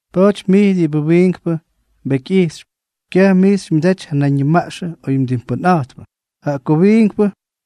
Pa̱a̱ty mij diꞌibʉ wiinkpʉ mbekyꞌijxypy, kyaj mij xymyʉdaty ja nayñimaꞌxʉ oy mdimpʉnꞌa̱jtpʉ, jaꞌa ko wiinkpʉ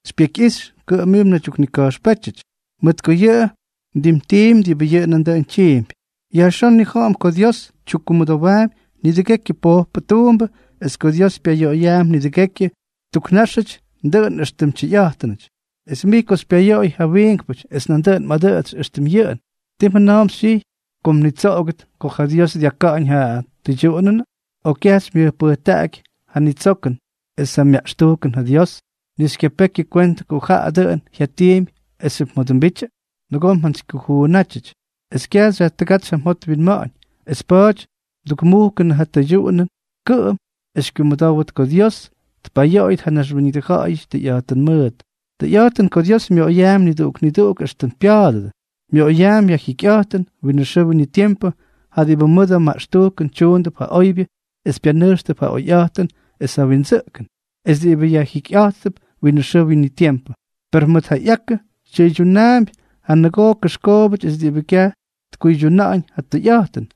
xypyekyꞌixy, kʉꞌʉm mij mnaydyuknika̱jxpétyʉty, mʉt ko yʉꞌʉ mdimtiimpy diꞌibʉ yʉꞌʉ nandʉꞌʉn tyiimpy. Yajxón nnija̱ꞌa̱m ko Dios tyukkumʉdowaampy nidʉgekyʉ pojpʉ tuumbʉ es ko Dios pyayoꞌoyaampy nidʉgekyʉ tuknáxʉty dʉꞌʉn éxtʉm tyʉyꞌa̱jtʉnʉty. Es mij ko xypyayoꞌoy ja wiinkpʉty es nandʉꞌʉn mꞌadʉꞌʉtsy éxtʉm yʉꞌʉn, ¿ti mjʉna̱a̱mp xytyijy ko mnitsoꞌogʉt ko ja Dios dyaka̱ꞌa̱ñ ja tʉydyuꞌunʉnʉ? ¿O kyaj xymyʉjpʉjtaꞌaky ja tsyojkʉn es ja myaꞌxtujkʉn ja Dios, ni xykyapekyʉ kwentʉ ko jaꞌa dʉꞌʉn jyatiimpy esxyʉp mjodʉmbityʉ? Nʉgoo mjantsykyujuunʉty es kyaj xyajtʉgátsy ja mjot mwinma̱ꞌa̱ñ, es pa̱a̱ty mdukmujkʉnʉ ja tʉydyuꞌunʉn kʉꞌʉm es xykyumʉdówʉt ko Dios tpayoꞌoyʉt ja naxwíñʉdʉ ja̱ꞌa̱yʉty tʉyꞌa̱jtʉn mʉʉt. Tʉyꞌa̱jtʉn ko Dios myoꞌoyaampy niduꞌuk niduꞌuk éxtʉm pya̱a̱dʉdʉ. Myoꞌoyaampy ja jyikyꞌa̱jtʉn winʉ xʉʉ winʉ tiempʉ ja diꞌibʉ mʉdʉ maꞌxtujkʉn tyuundʉp ja oybyʉ es pyanʉjxtʉp ja oyꞌa̱jtʉn es ja windsʉꞌkʉn es diꞌibʉ yajtukjikyꞌátʉp winʉ xʉʉ winʉ tiempʉ; per mʉt ja ꞌyakʉ tyʉydyunaampy ja nʉgoo kʉxkoobʉty es diꞌibʉ kyaj tkuydyuna̱ꞌa̱ñ ja tʉyꞌa̱jtʉn,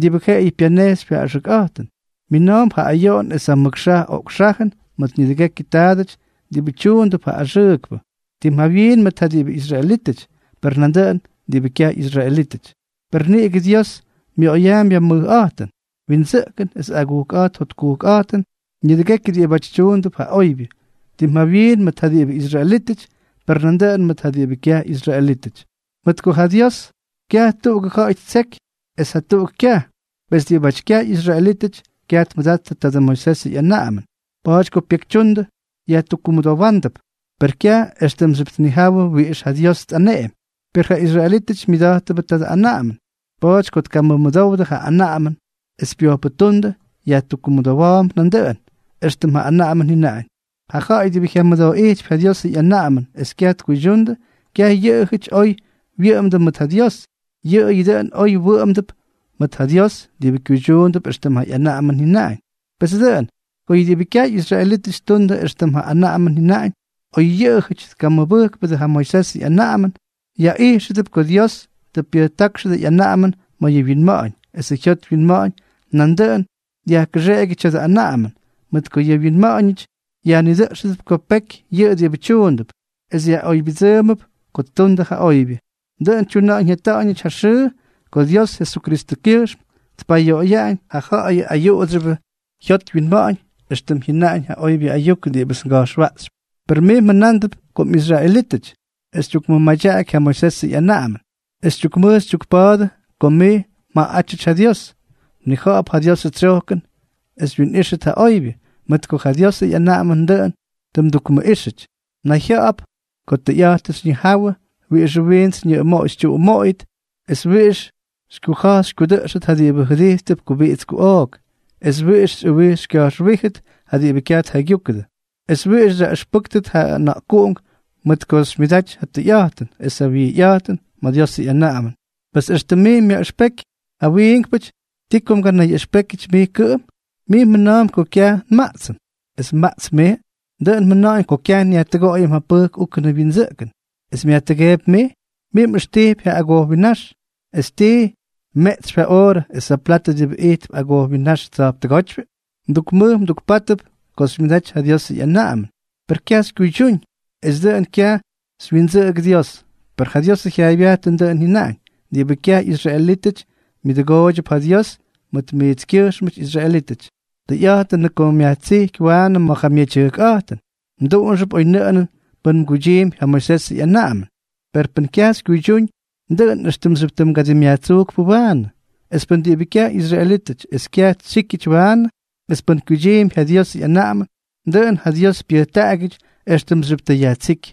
diꞌibʉ jaꞌayʉ pyanejxypy ja axʉkꞌa̱jtʉn. Mina̱a̱mp ja ayoꞌon es ja mʉk xaj ok xajʉn mʉt nidʉgekyʉ taadʉty diꞌibʉ tyuundʉp ja axʉʉkpʉ, tim jawyiin mʉt ja diꞌibʉ israelítʉty, per nandʉꞌʉn mʉt ja diꞌibʉ kyaj ꞌyisraelítʉty. Per niꞌigʉ Dios myoꞌoyaampy ja mʉjꞌa̱jtʉn, windsʉꞌkʉn es agujkꞌa̱jt jotkujkꞌa̱jtʉn nidʉgekyʉ diꞌibáty tyuundʉp ja oybyʉ, tim jawyiin mʉt ja diꞌibʉ israelítʉty, per nandʉꞌʉn mʉt ja diꞌibʉ kyaj ꞌyisraelítʉty. Mʉt ko ja Dios kyaj tuꞌugʉ ja̱ꞌa̱y ttseky es jatuꞌuk kyaj. Pes diꞌibáty kyaj ꞌyisraelítʉty, kyaj tmʉdattʉ tadʉ Moisesʉ ꞌyanaꞌamʉn. Pa̱a̱ty ko pyekytyundʉ, yajtukkumʉdówdʉp, per kyaj éxtʉmxyʉp tnijáwʉdʉ wiꞌix ja Dios tꞌaneꞌemy. Per ja israelítʉty myʉda̱jttʉbʉ tadʉ anaꞌamʉn. Pa̱a̱ty ko tkamʉmʉdowdʉ ja anaꞌamʉn es pyojpʉtúndʉ, yajtukkumʉdówdʉp éxtʉm ja anaꞌamʉn jyʉnaꞌañ. Ja ja̱ꞌa̱y diꞌibʉ jyamʉdooꞌijtypy ja Diosʉ ꞌyanaꞌamʉn es kyaj tkuydyundʉ, kyaj yʉꞌʉjʉty oy wyʉꞌʉmdʉ mʉt ja Dios, yʉꞌʉyʉ dʉꞌʉn oy wʉꞌʉmdʉp mʉt ja Dios diꞌibʉ kyuydyuundʉp éxtʉm ja ꞌyanaꞌamʉn jyʉnaꞌañ. Pes dʉꞌʉn, ko yʉ diꞌibʉ kyaj ꞌyisraelítʉty ttundʉ éxtʉm ja anaꞌamʉn jyʉnaꞌañ, oy yʉꞌʉjʉty tkamʉda̱jtpʉdʉ ja Moisesʉ ꞌyanaꞌamʉn, yaꞌijxʉdʉp ko Dios tʉ pyʉjtákxʉdʉ ꞌyanaꞌamʉn ma̱ yʉ wyinma̱ꞌa̱ñ, esʉ jyot wyinma̱ꞌa̱ñ nandʉꞌʉn dyajkʉxeꞌegyʉ tya̱dʉ anaꞌamʉn, mʉt ko yʉ wyinma̱ꞌa̱ñʉty yajnidʉꞌxʉp ko peky yʉꞌʉ diꞌibʉ tyuundʉp es yaꞌoybyʉdsʉʉmʉp ko ttundʉ ja oybyʉ. Dʉꞌʉn tyuna̱ꞌa̱ñ jyata̱ꞌa̱ñʉty ja xʉʉ ko Dios Jesukristʉkyʉjxm tpayoꞌoyaꞌañ ja ja̱ꞌa̱yʉ ayuꞌudsyʉbʉ jyot wyinma̱ꞌa̱ñ, éxtʉm jyʉnaꞌañ ja oybyʉ ayuk diꞌibʉts nga̱jxwaꞌxypy. Per mij mjʉna̱a̱mp ko mꞌisraelítʉty, es xytyukmadaꞌaky ja Moisesʉ ꞌyanaꞌamʉn, es xytyukmʉj xytyukpa̱a̱dʉ ko mij mjaꞌaꞌátyʉty ja Dios. Mnija̱ꞌa̱p ja Diosʉ tsyojkʉn es xywyinꞌíxʉt ja oybyʉ, mʉt ko ja Dios ꞌyanaꞌamʉnʉ dʉꞌʉn tʉ mdukniꞌíxʉty. Mnayjya̱ꞌa̱p ko tʉyꞌa̱jtʉn xyñijawʉ wiꞌixʉ wiints xyñʉꞌʉmoꞌoy xytyuꞌumoꞌoyʉt es wiꞌix xykyuja̱j xykyudʉꞌxʉt ja diꞌibʉ jʉdijtp kubiꞌits kuꞌook, es wiꞌix xyꞌʉwij xykya̱jxwíjʉt ja diꞌibʉ kyaj tjaygyúkʉdʉ, es wiꞌix xyaꞌʉxpʉ́kʉt ja ʉna̱ꞌkuꞌunk mʉt ko xymyʉdaty ja tʉyꞌa̱jtʉn es ja wijyꞌa̱jtʉn ma̱ Diosʉ ꞌyanaꞌamʉn. Pes éxtʉm mij myaꞌʉxpejkypy ja wiinkpʉty, ¿ti ko mganayyaꞌʉxpékyʉty mij kʉꞌʉm? Mij mjʉna̱a̱mp ko kyaj nmaꞌtsʉm, ¿es mmaꞌtsp mij? Dʉꞌʉn mjʉna̱ꞌa̱ñ ko kyaj nyajtʉgoꞌoyʉm ja pʉjk úkʉnʉ wyindsʉꞌkʉn, ¿es myajtʉgeepy mij? Mij mꞌʉxtijpy ja agojwinnáx, ¿es tii, mmeꞌtsypy ja oorʉ es ja platʉ diꞌibʉ ijtp agojwinnáx tsya̱jptʉgótyʉ? Mdukmʉj mdukpátʉp ko xymyʉdaty ja Diosʉ ꞌyanaꞌamʉn, per kyaj xykyuydyúñ, es dʉꞌʉn kyaj xywyindsʉꞌʉgʉ Dios. Pes ja Diosʉ jyaaybyajtʉn dʉꞌʉn jyʉnaꞌañ: “Diꞌibʉ kyaj ꞌyisraelítʉty myʉdʉgooydyʉp ja Dios mʉt miitskyʉjxmʉty israelítʉty.” Tʉyꞌa̱jtʉnʉꞌʉ ko myajtsíky waanʉ ma̱ ja myedyʉjkꞌa̱jtʉn, mduꞌunxʉp oynʉꞌʉnʉn pʉn mguydyiimpy ja Moisesʉ ꞌyanaꞌamʉn. Per pʉn kyaj xykyuydyúñ, dʉꞌʉn éxtʉmxyʉp mgadimꞌyajtsujkpʉ waanʉ. Es pʉn diꞌibʉ kyaj ꞌyisraelítʉty es kyaj tsyíkyʉty waanʉ, es pʉn kyuydyiimpy ja Diosʉ ꞌyanaꞌamʉn, dʉꞌʉn ja Dios pyʉjtaꞌagyʉty éxtʉmxyʉp tʉ yajtsíky.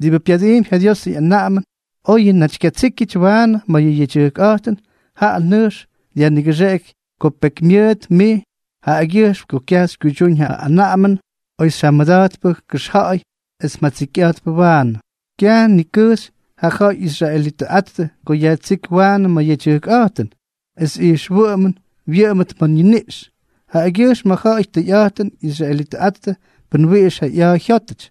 Diꞌibʉ pyadiimpy ja Diosʉ ꞌyanaꞌamʉn oyʉ naty kyatsíkyʉty waanʉ ma̱ yʉ yedyʉjkꞌa̱jtʉn, jaꞌa nʉjx dyajnigʉxeꞌeky ko pekymyʉʉt mij jaꞌagyʉjxm ko kyaj xykyuydyúñ ja anaꞌamʉn oy xyjamʉda̱jtpʉ kʉxja̱ꞌa̱y es mjatsikyꞌa̱jtpʉ waanʉ. Kyaj nikʉjxy ja ja̱ꞌa̱y ꞌyisraelitʉꞌattʉ ko yajtsíky waanʉ ma̱ yʉ yedyʉjkꞌa̱jtʉn esʉ ijxwʉꞌʉmʉn wyʉꞌʉmʉt ma̱ niniꞌx, jaꞌagyʉjxm ja ja̱ꞌa̱y tʉyꞌa̱jtʉn ꞌyisraelitʉꞌattʉ pʉn wiꞌix ja ꞌya̱a̱ jyótʉty,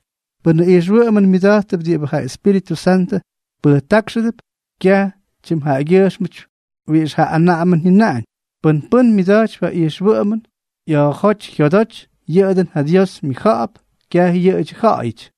pʉ́nʉ ijxwʉꞌʉmʉn myʉda̱jttʉp diꞌibʉ ja Espíritʉ Santʉ pʉjtákxʉdʉp, kyaj tyimjaꞌagyʉjxmʉty wiꞌix ja anaꞌamʉn jyʉnaꞌañ. Pʉn pʉ́n myʉda̱jtypy ja ijxwʉꞌʉmʉn ꞌya̱a̱jóty jyodoty, yʉꞌʉ dʉꞌʉn ja Dios myʉjja̱ꞌa̱p, kyaj yʉꞌʉdyʉ ja̱ꞌa̱yʉty.